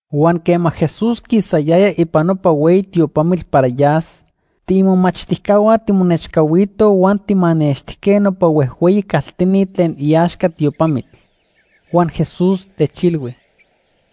Huan quema Jesús quisayaya ipan nopa hueyi tiopamitl para yas, tiimomachtijcahua timonechcahuitoj huan tijmanextijque nopa huejhueyi caltini tlen iaxca tiopamitl. Huan Jesús techilhui: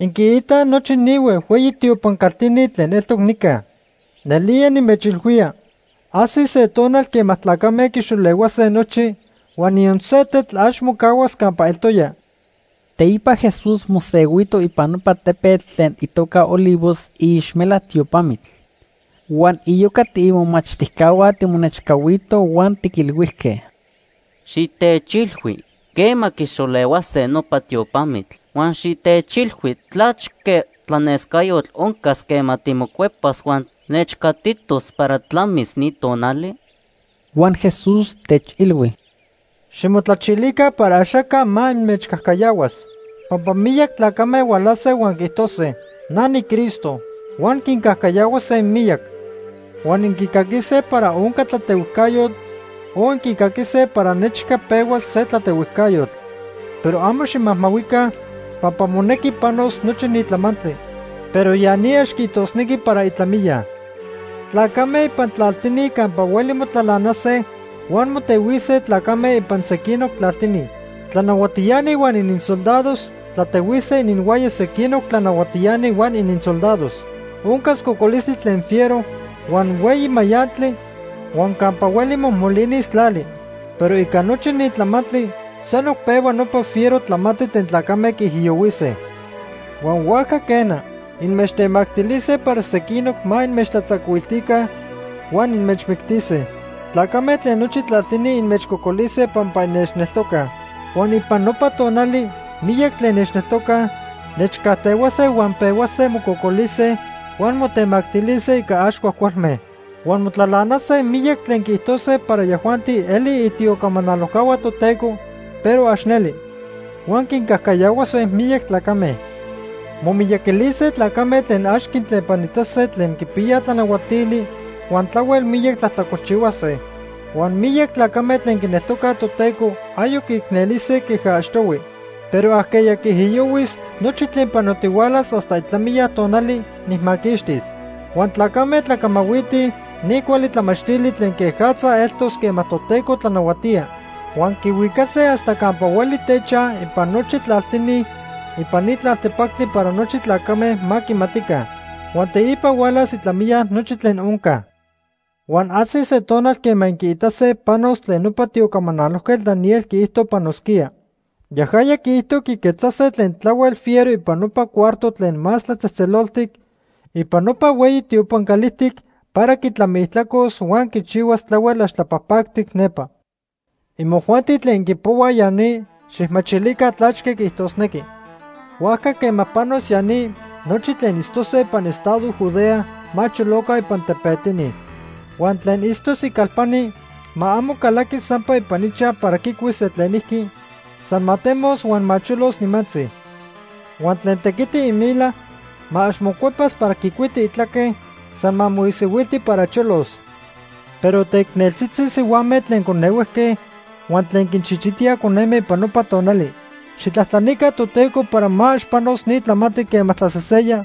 ―Inquiitaj nochi ni huejhueyi tiopan caltini tlen eltoc nica. Nelía nimechilhuía, ajsis se tonal quema tlacame quixolehuase nochi huan niyon se tetl ax mocahuas campa eltoya. Teipa Jesús mosehuito ipan nopa tepetl tlen itoca Olivos iixmelac tiopamitl. Huan iyoca tiimomachtijcahua timonechcahuitoj huan tiquilhuijque: ―Xitechilhui quema quixolehuase nopa tiopamitl. Huan xitechilhui tlachque tlanescayotl oncas quema timocuepas huan nechcatitos para tlamis ni tonali. Huan Jesús techilhui: ―Ximotlachilica para axaca ma inmechcajcayahuas. Pampa miyac tlacame hualase huan quiijtose: ‘Na niCristo.’ Huan quincajcayahuase miyac. Huan inquicaquise para onca tlatehuijcayotl o inquicaquise para nechca pehuas se tlatehuijcayotl. Pero amo ximajmahuica pampa monequi panos nochi ni tlamantli. Pero ya ni ax quiijtosnequi para itlamiya. Tlacame ipan tlaltini campa hueli motlalanase huan motehuise tlacame ipan sequinoc tlaltini. Tlanahuatiani huan ininsoldados tlatehuise ininhuaya sequinoc tlanahuatiani huan ininsoldados. Oncas cocolistli tlen fiero, huan hueyi mayantli huan campa hueli mojmolinis tlali. Pero ica nochi ni tlamantli sanoc pehua nopa fiero tlamantli tlen tlacame quiijiyohuise. “Huan huajca, quena, inmechtemactilise para sequinoc ma inmechtlatzacuiltica huan inmechmictise. Tlacame tlen nochi tlaltini inmechcocolise pampa innechneltocaj. Huan ipan nopa tonali miyac tlen nechneltocaj, nechcajtehuase huan pehuase mococolise huan motemactilise ica ax cuajcualme. “Huan motlalanase miyac tlen quiijtose para yajuanti elij itiocamanalojcahua Toteco, pero ax neli, huan quincajcayahuase miyac tlacame. Momiyaquilise tlacame tlen ax quintlepanitase tlen quipiya tlanahuatili huan tlahuel miyac tlajtlacolchihuase. Huan miyac tlacame tlen quineltocaj Toteco ayoc quiicnelise queja achtohui. Pero ajqueya quiijiyohuis nochi tlen panotihualas hasta itlamiya tonali, nijmaquixtis. Huan tlacame tlacamahuitij ni cuali tlamachtili tlen quejatza eltos quema Toteco tlanahuatía. Huan quihuicase hasta campa hueli techaj ipan nochi tlaltini ipan ni tlaltepactli para nochi tlacame ma quimatica. Huan teipa hualas itlamiya nochi tlen onca. “Huan ajsis se tonal quema inquiitase panos tlen nopa tiocamanalojquetl Daniel quiijto panosquía. Yajaya quiijto quiquetzase tlen tlahuel fiero ipan nopa cuarto tlen Más Tlatzejtzeloltic ipan nopa hueyi tiopan calijtic para quitlamiijtlacos huan quichihuas tlahuel ax tlapajpactic nepa. (Imojuanti tlen inquipohuaj ya ni, xijmachilica tlachque quiijtosnequi.) Huajca quema panos ya ni, nochi tlen itztose ipan estado Judea ma choloca ipan tepetini. Huan tlen itztos icalpani ma amo calaquis sampa ipan ichaj para quicuis se tlenijqui, san ma temos huan ma cholos nimantzi. Huan tlen tequiti imila, ma ax mocuepas para quicuiti itlaque, san ma moisihuilti para cholos. ¡Pero teicneltzitzi sihuame tlen conehuejque huan tlen quinchichitíaj coneme ipan nopa tonali! Xijtlajtlanica Toteco para ma ax panos ni tlamantli quema tlaseseya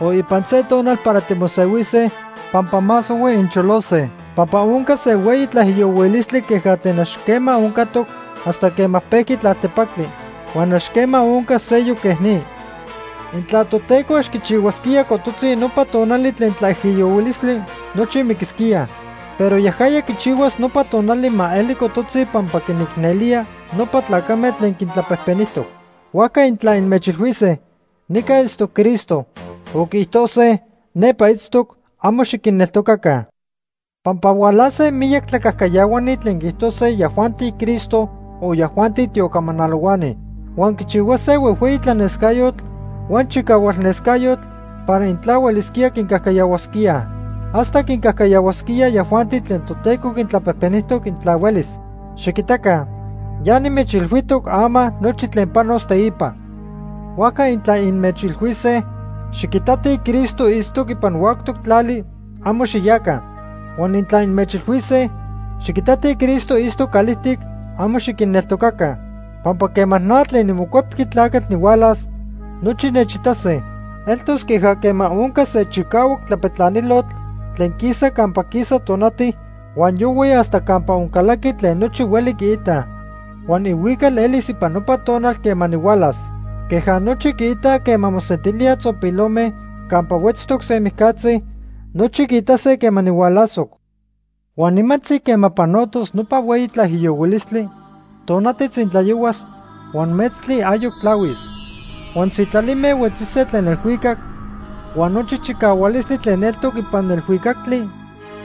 o ipan se tonal para timosehuise pampa más ohui incholose. Pampa oncas se hueyi tlaijiyohuilistli queja tlen ax quema oncatoc hasta quema pejqui tlaltepactli. Huan ax quema oncas seyoc quej ni. Intla Toteco ax quichihuasquía cototzi nopa tonali tlen tlaijiyohuilistli, nochi miquisquíaj. Pero yajaya quichihuas nopa tonali ma eli cototzi pampa quinicnelía nopa tlacame tlen quintlapejpenijtoc. “Huajca intla inmechilhuise: ‘Nica itztoc Cristo’, o quiijtose: ‘Nepa itztoc’, amo xiquinneltocaca. Pampa hualase miyac tlacajcayahuani tlen quiijtose yajuanti Cristo, o yajuanti tiocamanalohuani. Huan quichihuase huejhueyi tlanescayotl huan chicahualnescayotl para intla huelisquía quincajcayahuasquíaj. Hasta quincajcayahuasquíaj yajuanti tlen Toteco quintlapejpenijtoc intla huelis. Xiquitaca, ya nimechilhuijtoc ama nochi tlen panos teipa. “Huajca intla inmechilhuise: ‘Xiquitatij Cristo itztoc ipan huactoc tlali’, amo xiyaca. Huan intla inmechilhuise: ‘Xiquitatij Cristo itztoc calijtic’, amo xiquinneltocaca. Pampa quema na tlen niMocuepqui Tlacatl nihualas, nochi nechitase. Eltos queja quema onca se chicahuac tlapetlanilotl tlen quisa campa quisa tonati huan yohui hasta campa oncalaqui tlen nochi huelij quiitaj. Huan ihuical elis ipan nopa tonal quema nihualas. Queja nochi quiitaj quema mosentilíaj tzopilome campa huetztoc se mijcatzi, nochi quiitase quema nihualasoc. “Huan nimantzi quema panotos nopa hueyi tlaijiyohuilistli, tonati tzintlayohuas huan metztli ayoc tlahuis. Huan sitlalime huetzise tlen elhuicac, huan nochi chicahualistli tlen eltoc ipan elhuicactli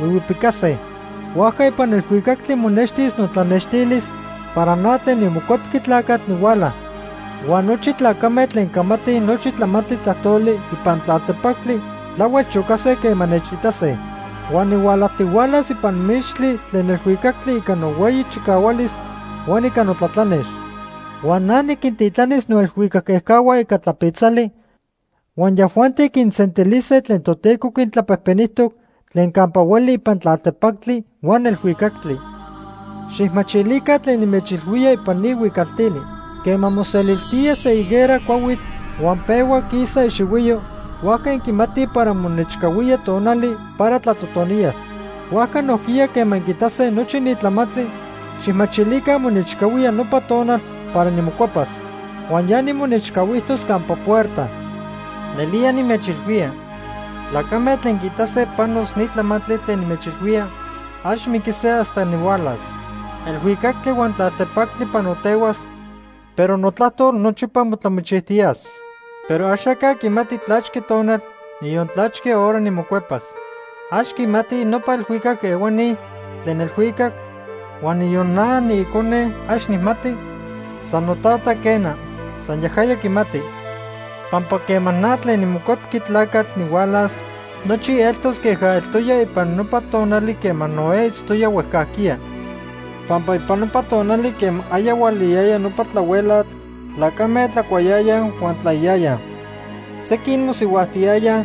huihuipicase. Huajca ipan elhuicactli monextis notlanextilis para na tlen niMocuepqui Tlacatl nihuala. Huan nochi tlacame tlen camatij nochi tlamantli tlajtoli ipan tlaltepactli tlahuel chocase quema nechitase. Huan nihualajtihualas ipan mixtli tlen elhuicactli ica nohueyi chicahualis huan ica notlatlanex. Huan na niquintitlanis noelhuicac ejcahua ica tlapitzali huan yajuanti quinsentilise tlen Toteco quintlapejpenijtoc tlen campa hueli ipan tlaltepactli huan elhuicactli. “Xijmachilica tlen nimechilhuía ipan ni huicaltili. Quema moseliltía se higuera cuahuitl huan pehua quisa ixihuiyo, huajca inquimatij para monechcahuía tonali para tlatotoniyas. Huajca nojquiya quema inquiitase nochi ni tlamantli, xijmachilica monechcahuía nopa tonal para nimocuepas. Huan ya nimonechcahuijtos campa puerta. Nelía nimechilhuía, tlacame tlen quiitase panos ni tlamantli tlen nimechilhuía, ax miquise hasta nihualas. Elhuicactli huan tlaltepactli panotehuas, pero notlajtol nochipa motlamichijtiyas. “Pero axaca quimati tlachque tonal, niyon tlachque hora nimocuepas. Ax quimatij nopa elhuicac ehuani tlen elhuicac, huan niyon na niIcone ax nijmati, san noTata, quena. San yajaya quimati. “Pampa quema na tlen niMocuepqui Tlacatl nihualas, nochi eltos queja eltoya ipan nopa tonali quema Noé itztoya huejcajquiya. Pampa ipan nopa tonali quema aya hualayaya nopa tlahuelatl, tlacame tlacuayayaj huan tlaiyayaj. Sequin mosihuajtiyayaj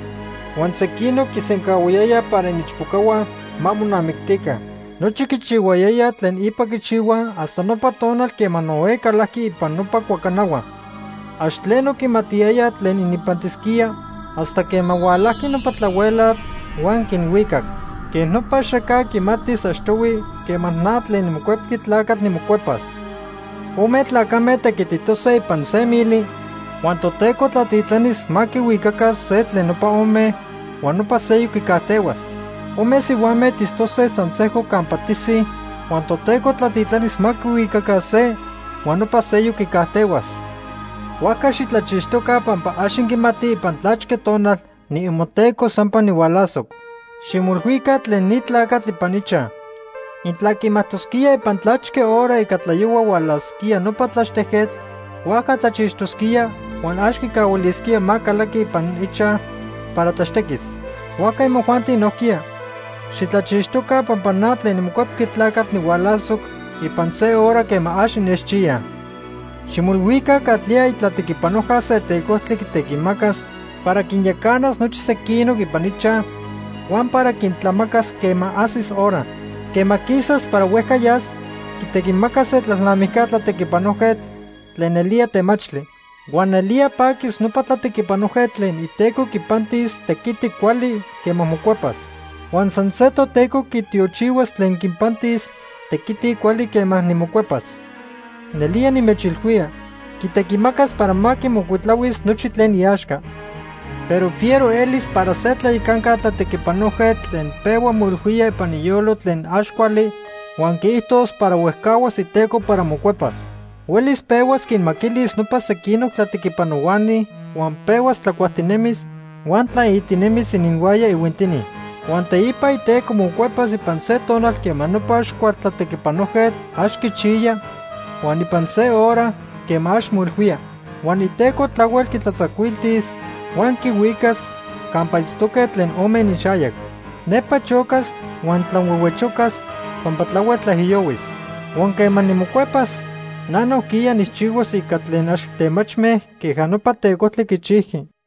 huan sequinoc quisencahuayayaj para iniichpocahua ma monamictica. Nochi quichihuayayaj tlen ipa quichihuaj hasta nopa tonal quema Noé calajqui ipan nopa cuacanahua. Ax tleno quimatiyayaj tlen ininpantisquía hasta quema hualajqui nopa tlahuelatl huan quinhuicac. Quej nopa axaca quimatis achtohui quema na tlen niMocuepqui Tlacatl, nimocuepas. Ome tlacame tequititose ipan se mili huan Toteco tlatitlanis ma quihuicaca se tlen nopa ome huan nopa seyoc quicajtehuas. Ome sihuame tistose san sejco campa tisij huan Toteco tlatitlanis ma quihuicaca se, huan nopa seyoc quicajtehuas. “Huajca xitlachixtoca pampa ax inquimatij ipan tlachque tonal niimoTeco sampa nihualasoc. Ximoilhuica tlen ni tlacatl ipan ichaj. Intla quimajtosquía ipan tlachque hora ica tlayohua hualasquía nopa tlaxtejquetl, huajca tlachixtosquía huan ax quicahuilisquía ma calaqui ipan ichaj para tlaxtequis. Huajca imojuanti nojquiya, xitlachixtoca pampa na tlen niMocuepqui Tlacatl nihualasoc ipan se hora quema ax innechchiyaj. “Ximoilhuica catlía itlatequipanojca se tecojtli quitequimacas para quinyacanas nochi sequinoc ipan ichaj huan para quintlamacas quema ajsis hora. Quema quisas para huejca yas, quitequimacas se tlalnamijca tlatequipanojquetl tlen nelía temachtli. Huan nelía paquis nopa tlatequipanojquetl tlen iteco quipantis tequiti cuali quema mocuepas. Huan san se Toteco quitiochihuas tlen quinpantis tequiti cuali quema nimocuepas. Nelía nimechilhuía, quitequimacas para ma quimocuitlahuis nochi tlen iaxca. Pero fiero elis para se tlayacanca tlatequipanojquetl tlen pehua moilhuía ipan iyolo tlen ax cuali huan quiijtos para huejcahuas iteco para mocuepas. Huelis pehuas quinmaquilis nopa sequinoc tlatequipanohuani huan pehuas tlacuajtinemis huan tlaitinemis ininhuaya ihuintini. Huan teipa iteco mocuepas ipan se tonal quema nopa ax cual tlatequipanojquetl ax quichiya huan ipan se hora quema ax moilhuía. Huan iteco tlahuel quitlatzacuiltis huan quihuicas campa itztoque tlen ome ininxayac. Nepa chocas huan tlanhuehuechocas pampa tlahuel tlaijiyohuis. Huan quema nimocuepas, na nojquiya nijchihuas ica tlen ax temachme queja nopa tecojtli quichijqui.